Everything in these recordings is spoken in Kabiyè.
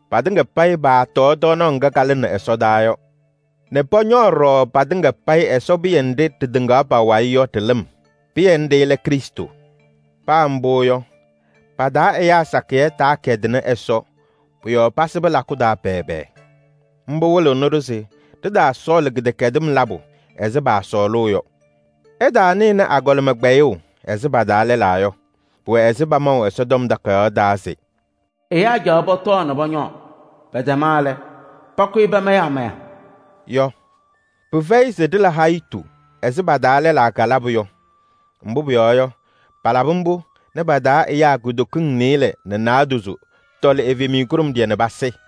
Patɩŋa payɩ paatɔɔ tɔɔnaɣ ŋga kalɩnɩ ɛsɔdaa yɔ nɛ pɔñɔɔ ɖɔɖɔ patɩŋa payɩ Ɛsɔ pɩyɛ nɖɩ ɖɩtɩŋaɣ pa-wayɩ yɔ ɖɩ-lɩm. Pɩyɛ nɖɩ lɛ Krɩstʋ. Paa mbʋ yɔ, pa-taa ɛyaa sakɩyɛ taakɛdɩnɩ Ɛsɔ. Pʋ-yɔɔ pasɩbɩ lakʋ taa pɛɛbɛɛ. Mbʋ wɩlɩɣnɩ-ɖʋ se ɖɩtaasɔɔlɩ kɩdɛkɛdɩm labʋ ɛzɩ paasɔɔlʋʋ yɔ. Ɩtaanɩnɩ agɔlɩma kpɛyʋʋ ɛzɩ pa-taa lɛlaa yɔ. Pʋwɛ ɛzɩ pamaʋ Ɛsɔtɔm Takayaɣ taa se: “Ɛyaa caɣaɣ pɔtɔɔ nɛ pɔñɔɔ, pɛtɛma lɛ, pakʋyɩ pamayɩ amaya” yɔ. Pɩfɛyɩ se ɖɩla hayitu ɛzɩ pa-taa lɛlaa kalabʋ yɔ. Mbʋ pʋyɔɔ yɔ, palabɩ mbʋ nɛ pa-taa ɛyaa kutokiŋ nɩɩlɛ nɛ naadozo tɔlɩ evemiye kʋɖʋmɖɩyɛ nɛ pasɩ.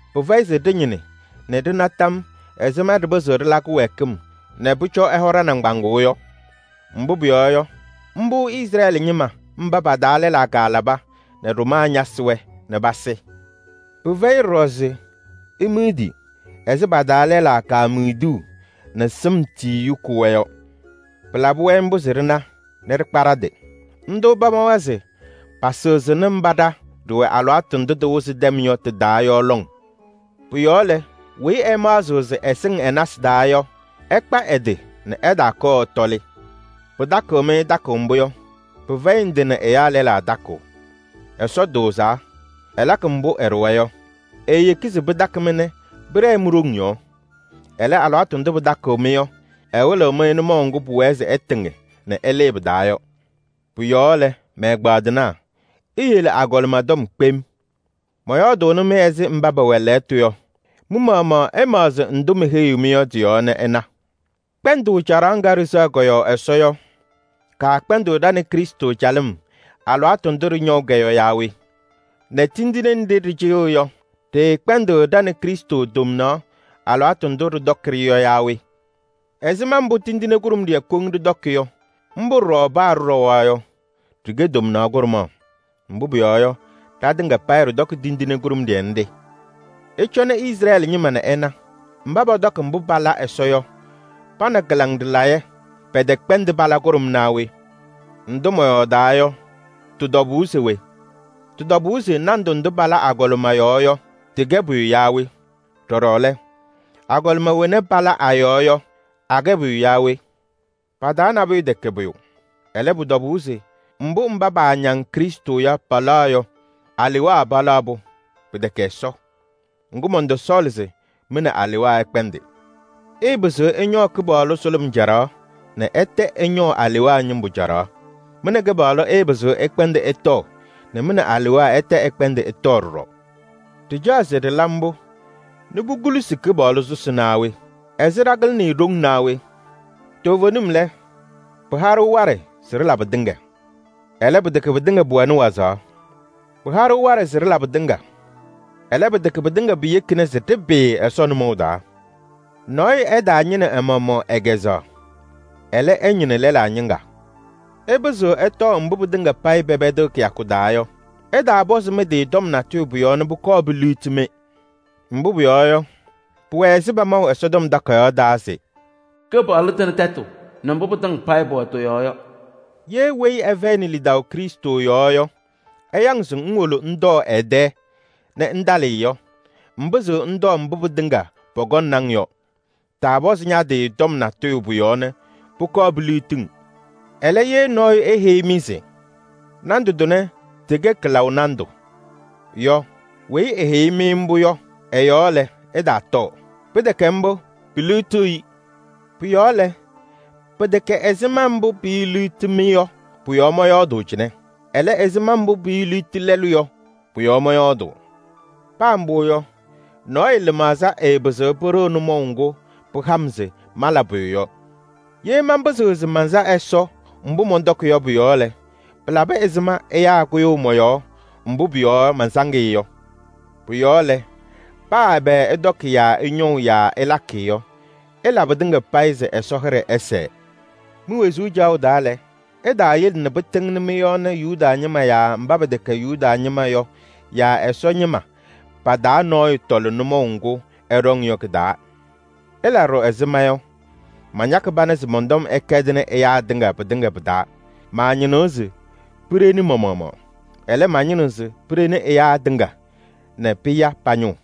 Pɩfɛyɩ ɖɔɖɔ se ɖɩñɩnɩ se ɖɩna tɔm ɛzɩma mbʋ ɖɩpɩzɩɣ ɖɩla kɩwɛɛkɩm nɛ pʋcɔ Kɩpaɣlʋ hɔ ɖa-nɩŋgbaŋʋʋ yɔ. Mbʋ pʋyɔɔ yɔ, mbʋ pa-taa lɛlaa kalaba nɛ ɖʋmaa ñasɩ-wɛ nɛ pasɩ. Pɩfɛyɩ ɖɔɖɔ se imidi ɛzɩ pa-taa lɛlaa kemiduu nɛ sɩm tiyiyu kʋ-wɛ yɔ. Pɩlabɩ-wɛ mbʋ se ɖɩna nɛ ɖɩkpa ɖa-tɩ. Ndʋ pamawa se pasɩɣzɩnɩ mba ɖa ɖɩwɛ alɩwaatʋ ndʋ tɩwɩzɩ tɛm yɔ tɩ-taa yɔ lɔŋ. Pʋ-yɔɔ lɛ, weyi ɛmaɣzɩɣ se ɛsɩŋ ɛ-nasɩ taa yɔ, ɛkpa ɛ-tɩ nɛ ɛtaakɔɔ ɛtɔlɩ. Pɩtakɩɣ-mɩ takʋʋ mbʋ yɔ, pɩfɛyɩ ndɩ nɛ ɛyaa lɛlaa takʋʋ. Ɛsɔ tʋʋzaa, ɛlakɩ mbʋ ɛɖʋwa yɔ. Eeyeki se pɩtakɩ-mɩ nɛ pɩɖɛɛ mi-ɖoŋ yɔɔ. Ɛlɛ, alɩwaatʋ ndʋ pɩtakɩɣ-mɩ yɔ, ɛwɩlɩɣ-mɩ nʋmɔʋ ŋgʋ ɩɩtɩŋ nɛ ɩlɩɩ pɩ-taa yɔ. Pʋ-yɔɔ lɛ, mɛ-ɛgbaadɩnaa, iyele agɔlɩma tɔm kpem. Mɔyɔɔdʋʋnɩ-mɩ ɛzɩ mba pɛwɛ lɛɣtʋ yɔ. Mɩ-maɣmaɣ ɩmaɣzɩ ndʋ meheyiɣ-mɩ yɔ tɩ-yɔɔ nɛ ɩna. Kpɛndʋʋ caɖaɣ ŋga ɖɩsɛɣ kɔ-yɔɔ Ɛsɔ yɔ, kaakpɛndɩɣ ɖa nɛ Krɩstʋ calɩm alɩwaatʋ ndʋ ɖɩñɔʋ-kɛ yɔ yaa we? Nɛ tindine nɖɩ ɖɩcɩyɩɣ yɔ, ɖɩɩkpɛndɩɣ ɖa nɛ Krɩstʋ tomnaɣ alɩwaatʋ ndʋ ɖɩtɔkɩ-ɖɩ yɔ yaa we? Ɛzɩma mbʋ tindine kʋɖʋmɖɩyɛ koŋ ɖɩtɔkɩ yɔ, mbʋ ɖɔɖɔ paa ɖɩɖɔwa yɔ, ɖɩkɛ tomnaɣ kʋɖʋmaɣ. Mbʋ pʋyɔɔ yɔ, ɖatɩŋa payɩ ɖɩtɔkɩ tindine kʋɖʋmɖɩyɛ nɖɩ. Ɩcɔnɩ Izrɛɛlɩ ñɩma nɛ ɩna: mba pɔtɔkɩ mbʋ pala Ɛsɔ yɔ, pa nɛ kɩlaŋ ɖɩlayɛ pɛtɛkpɛndɩ pala kʋɖʋm naa we? Ndʋ mɔyɔɔdaa yɔ, tɩ-tɔbʋʋ se we? Tɩ-tɔbʋʋ se nandʋ ndʋ pala agɔlɩma yɔɔ yɔ, tɩkɛ pʋyʋ yaa we? Ɖɔɖɔ lɛ, agɔlɩma wena pala a-yɔɔ yɔ, akɛ pʋyʋ yaa we? Pa-taa nabʋyʋ tɛkɛ pʋyʋ. Ɛlɛ, pʋ-tɔbʋʋ se mbʋ mba paañaŋ Krɩstʋ yɔ palaɣ yɔ, alewaa palaɣ-pʋ, pɩtɛkɛ Ɛsɔ. Ŋgʋ, mɔntɔsɔɔlɩ se mɩ nɛ alewaa ɩkpɛndɩ. Ɩɩpɩzɩɣ ɩñɔɔ Kɩpaɣlʋ sʋlʋm caɖaɣ nɛ ɩtɛ ɩñɔɔ alewaa ñɩmbʋ caɖaɣ. Mɩ nɛ Kɩpaɣlʋ ɩɩpɩzɩɣ ɩkpɛndɩ ɩtɔɔ nɛ mɩ nɛ alewaa ɩtɛ ɩkpɛndɩ ɩtɔɔ ɖɔɖɔ. Ɖɩcaɣ se ɖɩla mbʋ nɛ pukulusi Kɩpaɣlʋ sʋsɩ naa we? Ɛzɩ ɖakɩlɩnɩ-ɩ ɖoŋ naa we? Toovenim lɛ: “Pɩha-ɖʋ waɖɛ se ɖɩla pɩtɩŋa.” Ɛlɛ, pɩtɛkɛ pɩtɩŋa pʋwɛnɩ wazaɣ. “Pɩha-ɖʋ waɖɛ se ɖɩla pɩtɩŋa.” Ɛlɛ, pɩtɛkɛ pɩtɩŋa piyekina se ɖɩpɩɩ Ɛsɔ nʋmɔʋ taa. Nɔɔyʋ ɛtaañɩnɩ ɛ-maɣmaɣ ɛ-kɛzɛɣa. Ɛlɛ, ɛñɩnɩ lɛlaa ñɩŋga. Ɩpɩzɩɣ ɩtɔɔ mbʋ pɩtɩŋa payɩ pɛpɛdɩɣ kɩyakʋ taa yɔ. Ɩtaapɔzɩ mɩ-tɩ tɔm natʋyʋ pʋ-yɔɔ nɛ pʋkɔɔ piliɣti-mɩ. Mbʋ pʋyɔɔ yɔ, pʋwɛ ɛzɩ pamaʋ Ɛsɔtɔm Takayaɣ taa se: “Kɩpaɣlʋ tɩnɩ tɛtʋ nɛ mbʋ pɩtɩŋa payɩ pʋwɛ tɩ-yɔɔ yɔ.” Ye weyi ɛfɛyɩnɩ lidaʋ Krɩstʋ yɔɔ yɔ, ɛya-ŋ se ŋwolo ŋtɔɔ ɛ-tɛ nɛ ŋtalɩ yɔ, ŋpɩzɩɣ ŋtɔɔ mbʋ pɩtɩŋa pɔkɔŋnɩ-ŋ yɔ. Taapɔzɩ ña-tɩ tɔm natʋyʋ pʋ-yɔɔ nɛ pʋkɔɔ piliɣti-ŋ. Ɛlɛ, ye nɔɔyʋ eheyi-mɩ se: “Nandʋ tʋnɛ tɩkɛ kɩlaʋ nandʋ” yɔ, weyi eheyi-mɩ mbʋ yɔ ɛ-yɔɔ lɛ, ɩtaatɔɔ. Pɩtɛkɛ mbʋ, piliɣtiɣ-i. Pʋ-yɔɔ lɛ, pɩtɛkɛ ɛzɩma mbʋ piiliɣti-mɩ yɔ pʋ-yɔɔ mɔyɔɔdʋʋ cɩnɛ. Ɛlɛ, ɛzɩma mbʋ piiliɣti lɛlʋ yɔ pʋ-yɔɔ mɔyɔɔdʋʋ. Paa mbʋ yɔ, nɔɔyʋ lɩmaɣza ɛɛpɩzɩɣ pɩɖɩɣ nʋmɔʋ ŋgʋ pɩha-m se mala pʋyʋ yɔ. Ye manpɩzɩɣ se mansa Ɛsɔ mbʋ mɔntɔkɩ yɔ pʋ-yɔɔ lɛ, pɩlabɩ ɛzɩma ɛyaa kʋyʋʋ mɔ-yɔɔ mbʋ pʋ-yɔɔ mansaŋ-ɩ yɔ pʋ-yɔɔ? Pʋ-yɔɔ lɛ, paa ɛbɛ ɩtɔkɩ yaa ɩñɔʋ yaa ɩlakɩ yɔ, ɩla pɩtɩŋa payɩ se Ɛsɔ hɩɖɛ ɛsɛɛ. Mi-wezuu caɣʋ taa lɛ, ɩtaayele nɛ pɩtɩŋnɩ mɩ-yɔɔ nɛ Yuda ñɩma yaa mba pɛtɛkɛ Yuda ñɩma yɔ yaa Ɛsɔ ñɩma pa-taa nɔɔyʋ tɔlɩ nʋmɔʋ ŋgʋ ɛɖɔŋ yɔ kɩ-taa. Ɩla ɖɔɖɔ ɛzɩ ma yɔ: mañakɩ pana se mɔn-tɔm ɛkɛdɩnɩ ɛyaa tɩŋa pɩtɩŋa pɩ-taa. Maañɩnɩɣ se piɖeni ma-maɣmaɣ. Ɛlɛ, mañɩnɩɣ se piɖeni ɛyaa tɩŋa nɛ pɩya pa-ñʋʋ.